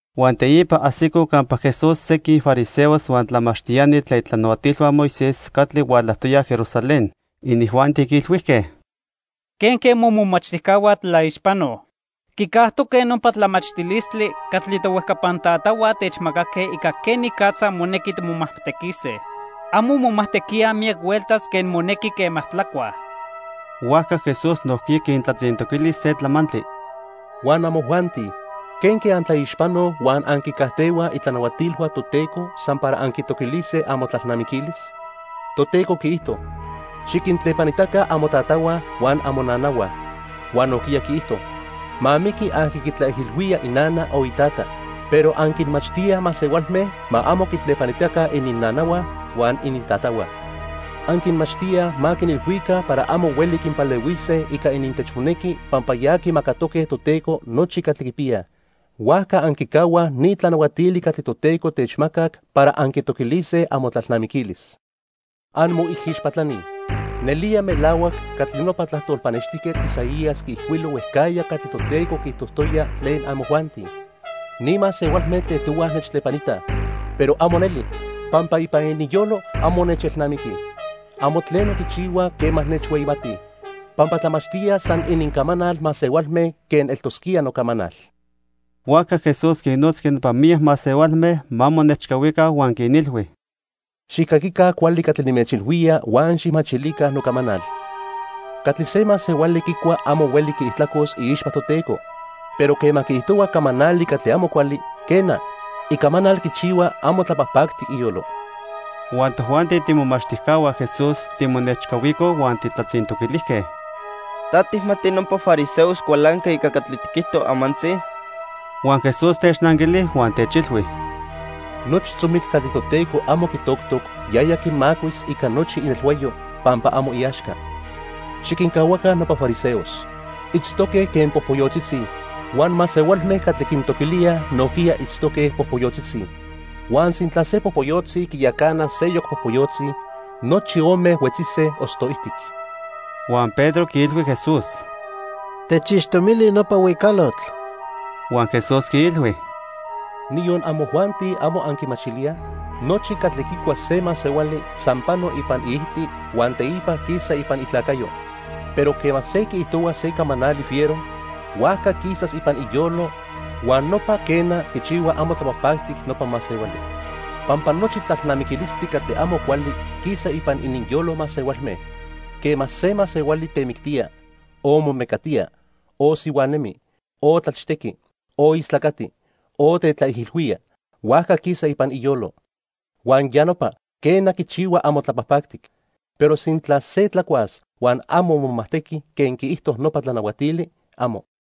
Huan teipa ajsicoj campa Jesús sequin fariseos huan tlamachtiani tlen itlanahuatilhua Moisés catli hualajtoyaj Jerusalén. Inijuanti quiilhuijque: —¿Quenque momomachtijcahua tlaixpanoj? Quicajtoque nopa tlamachtilistli catli tohuejcapan tatahua techmacaque ica quenicatza monequi timomajtequise. Amo momajtequíaj miyac hueltas quen monequi quema tlacuaj. Huajca Jesús nojquiya quintlatzintoquili se tlamantli. —Huan amojuanti ¿quenque antlaixpanoj huan anquicajtehuaj itlanahuatilhua Toteco san para anquitoquilise amotlalnamiquilis? Toteco quiijto: 'Xiquintlepanitaca amotatahua huan amonanahua.' Huan nojquiya quiijto: 'Ma miqui aqui quitlaijilhuía inana o itata.' Pero anquinmachtíaj masehualme ma amo quintlepanitaca ininnanahua huan inintatahua. Anquinmachtíaj ma quinilhuica para amo hueli quinpalehuise ica inintechmonequi pampa ya quimacatoque Toteco nochi catli quipiyaj. Huajca anquicahuaj ni tlanahuatili catli Toteco techmacac para anquitoquilise amotlalnamiquilis. Anmoijixpatlani. Nelía melahuac catli nopa tlajtol pannextijquetl Isaías quiijcuilo huejcajya catli Toteco quiijtojtoya tlen amojuanti: 'Ni masehualme tlejtohuaj nechtlepanitaj, pero amo neli, pampa ipan ininyolo amo nechelnamiquij. Amo tleno quichihuaj quema nechhueyimatij, pampa tlamachtíaj san inincamanal masehualme quen eltosquía nocamanal.' Huajca Jesús quinnotzqui nopa miyac masehualme ma monechcahuica huan quinilhui: —Xijcaquica cuali catli nimechilhuía huan xijmachilica nocamanal. Catli se masehuali quicua amo hueli quiijtlacos iixpa Toteco, pero quema quiijtohua camanali catli amo cuali, quena, icamanal quichihua amo tlapajpactic iyolo. Huan tojuanti tiimomachtijcahua Jesús timonechcahuicoj huan tijtlatzintoquilijque: —¿Ta tijmati nopa fariseos cualanque ica catli tiquijto amantzi? Huan Jesús technanquili huan techilhui: —Nochi tzomitl catli Toteco amo quitoctoc yaya quimacuis ica nochi inelhuayo, pampa amo iaxca. Xiquincahuaca nopa fariseos. Itztoque quen popoyotzitzi. Huan masehualme catli quintoquilíaj nojquiya itztoque popoyotzitzi. Huan sintla se popoyotzi quiyacana seyoc popoyotzi, nochi ome huetzise osto ijtic. Huan Pedro quiilhui Jesús: —Techixtomili nopa huicalotl. Huan Jesús quiilhui: —¿Niyon amojuanti, amo anquimachilíaj? Nochi catli quicua se masehuali san pano ipan iijti huan teipa quisa ipan itlacayo. Pero quema se quiijtohua se camanali fiero, huajca quisas ipan iyolo huan nopa, quena, quichihua amo tlapajpactic nopa masehuali. Pampa nochi tlalnamiquilistli catli amo cuali quisa ipan ininyolo masehualme. Quema se masehuali temictía, o momecatía, o sihuanemi, o tlachtequi, o istlacati, o tetlaijilhuía, huajca quisa ipan iyolo. Huan ya nopa, quena, quichihua amo tlapajpactic. Pero sintla se tlacuas huan amo momajtequi quen quiijto nopa tlanahuatili, amo.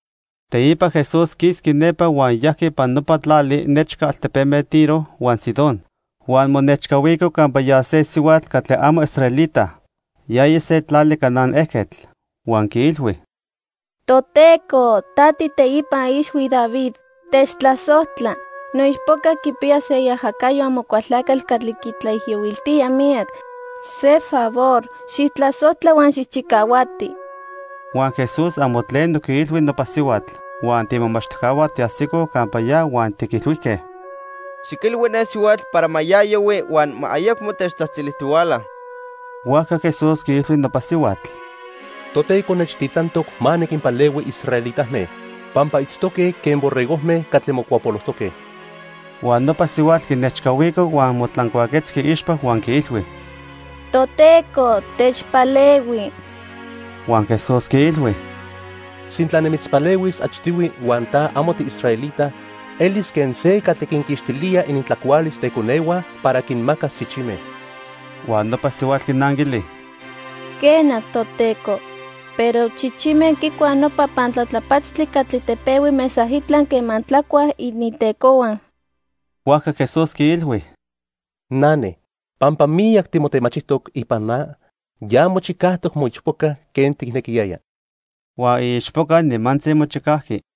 Teipa Jesús quisqui nepa huan yajqui ipan nopa tlali nechca altepeme Tiro huan Sidón. Huan monechcahuico campa ya se sihuatl catli amo israelita. Yaya se tlali Canaán ejquetl. Huan quiilhui: —Toteco, ta tiiteipa ixhui David, techtlasojtla. Noichpoca quipiya se iajacayo Amocualtlacatl catli quitlaijiyohuiltía miyac. Se favor xijtlasojtla huan xijchicahuati. Huan Jesús amo tleno quiilhui nopa sihuatl. Huan tiimomachtijcahua tiajsicoj campa ya huan tiquilhuijque: —Xiquilhui ne sihuatl para ma ya yohui huan ma ayacmo techtzajtzilijtihuala. Huajca Jesús quiilhui nopa sihuatl: —Toteco nechtitlantoc ma niquinpalehui israelitame, pampa itztoque quen borregojme catli mocuapolojtoque. Huan nopa sihuatl quinechcahuico huan motlancuaquetzqui iixpa huan quiilhui: —Toteco, techpalehui. Huan Jesús quiilhui: —Sintla nimitzpalehuis achtihui huan ta amo tiisraelita, elis quen se catli quinquixtilía inintlacualis teconehua para quinmacas chichime. Huan nopa sihuatl quinanquili: —Quena, Toteco, pero chichime quicuaj nopa pantlatlapatztli catli tepehui mesaitla quema tlacuaj inintecohua. Huajca Jesús quiilhui: —Nane, pampa miyac timotemachijtoc ipan na, ya mochicajtoc moichpoca quen tijnequiyaya. Huan iichpoca nimantzi mochicajqui.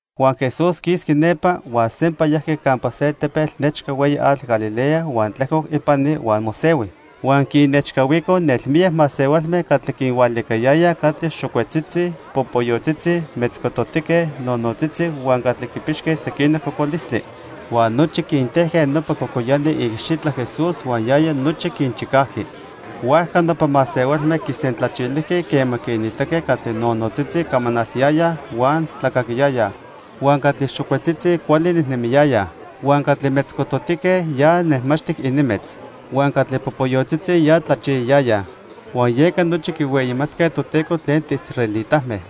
Huan Jesús quisqui nepa, huan sempa yajqui campa se tepetl nechca hueyi atl Galilea huan tlejcoc ipani huan mosehui. Huan quinnechcahuicoj nelmiyac masehualme catli quinhualiquiliyayaj catli xocuetzitzi, popoyotzitzi, metzcototique, nonotzitzi, huan catli quipixque sequinoc cocolistli. Huan nochi quintejque nopa cocoyani iicxitla Jesús huan yaya nochi quinchicajqui. Huajca nopa masehualme quisentlachilijque quema quinitaque catli nonotzitzi, camanaltiyayaj huan tlacaquiyayaj. Huan catli xocuetzitzi, cuali nejnemiyayaj. Huan catli metzcototique, ya nejmaxtic ininmetz. Huan catli popoyotzitzi, ya tlachiyayayaj. Huan yeca nochi quihueyimatque Toteco tlen tiisraelitame.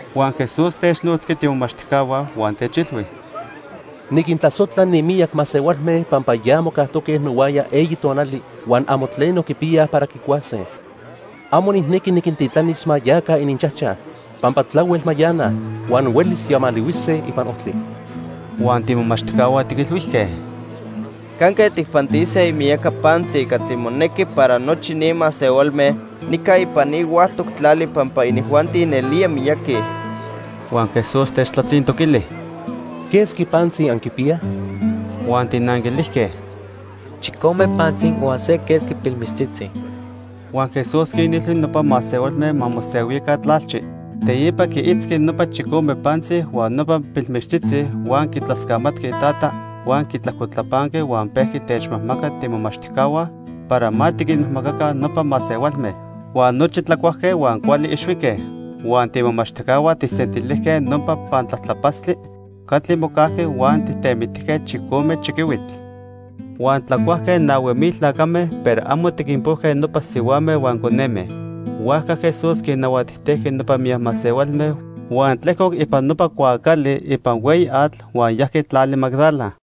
Huan Jesús technotzqui tiimomachtijcahua huan techilhui: —Niquintlasojtla ni miyac masehualme pampa ya mocajtoque nohuaya eyi tonali huan amo tleno quipiyaj para quicuase. Amo nijnequi niquintitlanis ma yaca ininchajchaj, pampa tlahuel mayanaj huan huelis yamalihuise ipan ojtli. Huan tiimomachtijcahua tiquilhuijque: —¿Canque tijpantise imiyaca pantzi catli monequi para nochi ni masehualme nica ipan ni huactoc tlali pampa inijuanti nelía miyaqui? Huan Jesús techtlatzintoquili: —¿Quesqui pantzi anquipiyaj? Huan tijnanquilijque: —Chicome pantzi huan se quesqui pilmichtzitzi. Huan Jesús quinilhui nopa masehualme ma mosehuica tlalchi. Teipa quiitzqui nopa chicome pantzi huan nopa pilmichtzitzi huan quitlascamatqui Itata huan quitlajcotlapanqui huan pejqui techmajmaca tiimomachtijcahua para ma tiquinmajmacaca nopa masehualme. Huan nochi tlacuajque huan cuali ixhuique. Huan tiimomachtijcahua tijsentilijque nopa pantlatlapatztli catli mocajqui huan tijtemitijque chicome chiquihuitl. Huan tlacuajque nahui mil tlacame, pero amo tiquinpojque nopa sihuame huan coneme. Huajca Jesús quinnahuatijtejqui nopa miyac masehualme, huan tlejcoc ipan nopa cuaacali ipan hueyi atl huan yajqui tlali Magdala.